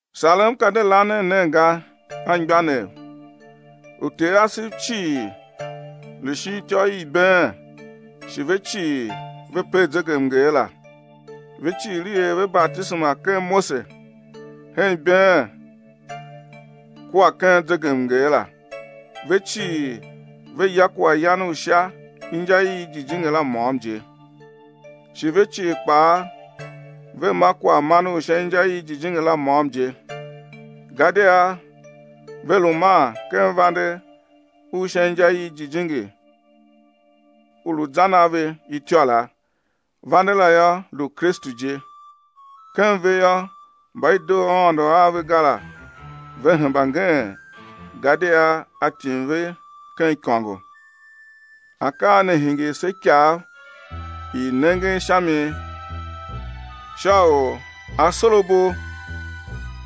Sarem ka de lanen nen ga, anmgbianev. Uter asev cii lu shin ityô i ibeen shi ve cii ve per zegemnger la. Ve cii i er ve batisema ken Mose, ken ibeen kua ken zegemnger la. Ve cii ve ya kwaghyan u sha inja i jijingi la môm je. Shi ve cii kpaa ve ma kwaghman u sha inja i jijingi la môm je. Gadia ve lu man ken vande u sha inja i jijingi u u lu zan a ve ityô la. Vande la yô, lu Kristu je. Ken ve yô, mba i doo Aôndo a ve ga la ve hemba ngeen gadia A tim ve ken ikôngo. Akaa ne hingir se ikav i nengen sha mi sha u asorabo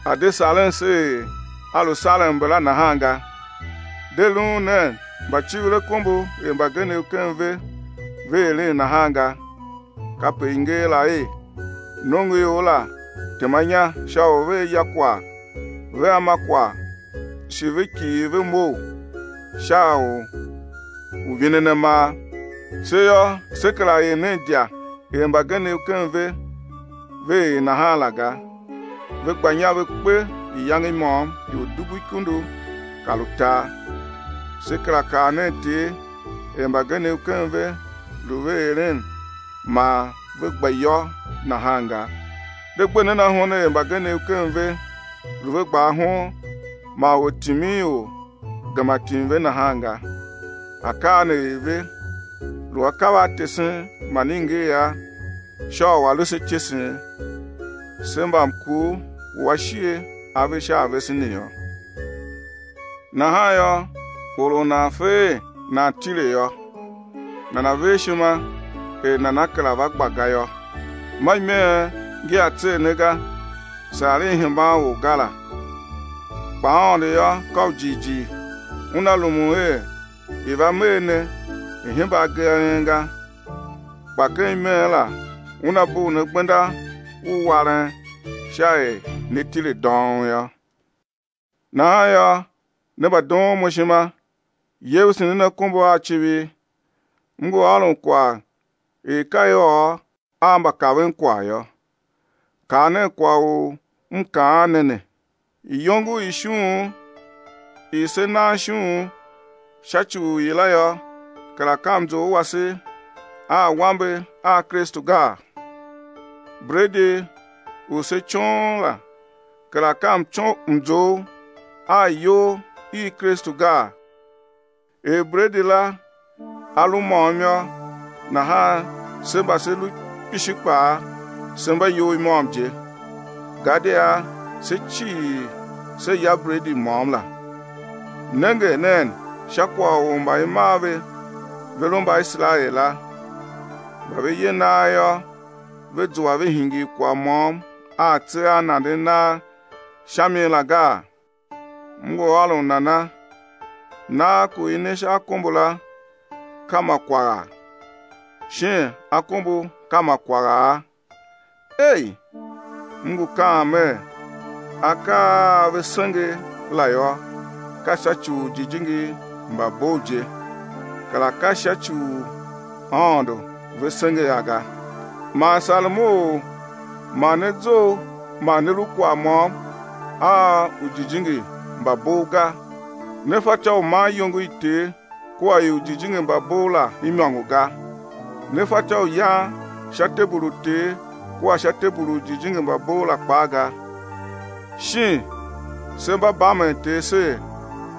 a̱ de saren se er a lu saren mbala nahan ga. De luun nen mbacivirakombo er mbagenev ken ve ve eren nahan ga. Kape i nger la er: Nongoior la tema inya sha u vea ya kwagh vea ma kwagh shi ve kighir ve mough sha sha u vinen amar. Se yô, se kera er nen idya er mbagenev ken ve ve er nahan la ga, ve gba inya ve kpe iyange i môm ior dubu ikundu kar utar. Se kera kar nen Ter er mbagenev ken ve lu ve eren man ve gba iyô nahan ga. De gbe nen ahon er mbagenev ken ve lu ve gba ahon man ortiminior gema tim ve nahan ga. Akaa ne er ve, lu akav a tesen man i nger a sha u a̱ lu se ityesen, se mba mkur u ashighe a ve sha a vese ne yô. Nahan yô, or u nan fe er nan tile yô, nana̱ ver ishima er nana kera va gba ga yô. Ma imeen ngi a tser ne ga, saa i hemban or ga la. Kpa Aôndo yô, ka u jighjigh, Una rumun er i̱ va mee ne i̱ hemba agee a en ga, kpa ken imeen la Una bugh ne gbenda u waren sha er ne tile dông yô. Nahan yô, ne mbadoon mo ishima, yevese nen akombo a civir. M ngu ôron kwagh er ka i ôr a mbakavenkwagh yô. Kar nen kwagh u m kaan ne ne: Iyongo i ishughun i se nan ishughun sha ci u i la yô, kera ka mzough wase a awambe a Kristu gaa? Bredi u se coon la, kera ka mzough a iyol i Kristu gaa? Er bredi la a lu môm yô, nahan se mba se lu kpishi kpaa, se mba iyol i môm je, gadia se cii se ya bredi môm la. Nenge nen sha kwagh u mba i mar ve ve lu Mbaiserael la. Mba ve ye nagh yô, ve zua ve hingir kwagh môm a atse a nanden nagh sha mi la gaa? M ngu ôron nana? Nagh ku i ne sha akombo la, ka ma kwagha? Shin akombo ka ma kwagha? Ei. M ngu kaan mer: Akaa a ve senge la yô, ka sha ci u ujijingi mba bov je, kera ka sha ci u Aôndo ve senge a ga. Man sarem u ma ne zough ma ne lu kwagh môm a ujijingi mba bov ga. Ne fatyô u man iyongo i Ter kua i ujijingi mba bov la imôngo ga. Ne fatyô u yan sha tebul u Ter kua sha tebul u ujijingi mba bov la kpaa ga. Shin se mba bamen Ter ser,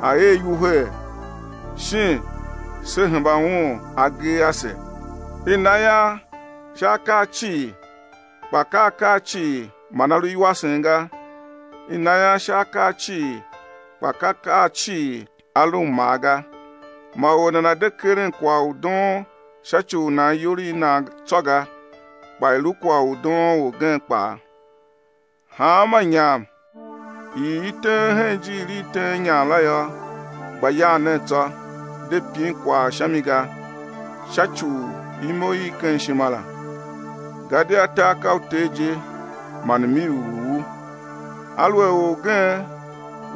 A̱ er iwuhee? Shin se hemba Un agee ase? I na ian sha akaa cii. Kpa ka akaa cii man a lu iwasen ga. I na ian sha akaa cii kpa ka akaa cii a lu mmaa ga. Ma or nana̱ de keren kwagh u doon sha ci u nan iyol i nan tsô ga, kpa i̱ lu kwagh u doon orgen kpaa. Hanma inyam i i teen hen ijiir i teen inyam la yô, gba yan nen tsô, de pin kwagh sha mi ga, sha ci u imo i ken ishima la. Gadia tar ka u Ter je, man m-iv u u. Aluer orgen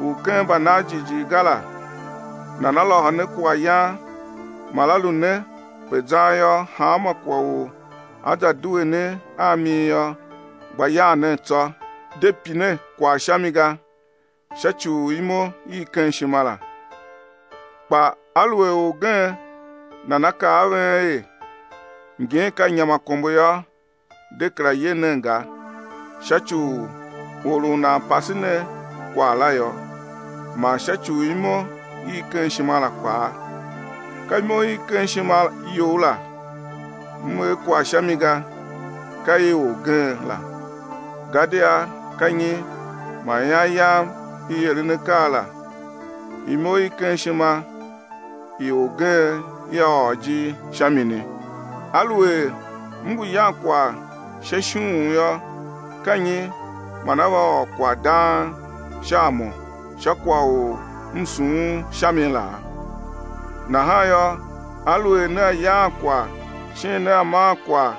u ken mbanan jighjigh ga la nana lôhô ne kwaghyan man a lu ne pe zan yô, hanma kwagh u á za due ne a mi yô, gba yan nen tsô, de pin kwagh sha mi ga sha ci u imo i ken ishima la. Kpa aluer orgen nana kaa a ven er: Ngin ka inyamakombo yô, de kera ye nen ga, sha ci u or u nan pase ne kwagh la yô, man sha ci u imo i ken ishima la kpaa. Ka imo i ken ishima you la, m er kwagh sha mi ga, ka i orgen la. Gadia ka nyi man ian yam i eren akaa la, imo i ken ishima i orgen ia ôr ijir sha mini? Aluer m ngu yan kwagh sha ishughun yô, ka nyi man á va ôr kwagh dang sha a mo sha kwagh u m sughun sha mi laa? Nahan yô, aluer nea yaan kwagh, shin nea maan kwagh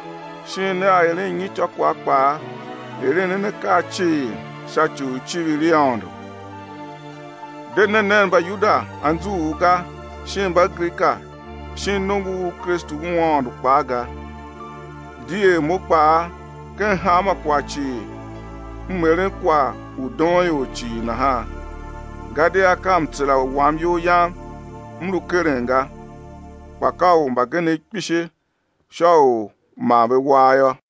shin nea eren nyityô kwagh kpaa, eren nen akaa cii sha ci u icivir i Aôndo. De ne nen Mbayuda anzughul ga shin Mbagrika shin nongo u Kristu u Aôndo kpaa ga, di er mo kpaa, ken hanma kwagh cii m eren kwagh u doon ior cii nahan, gadia ka mtsera wam iyol yam m lu keren ga, kpa ka u mbagenev kpishi sha u ma ve war yô.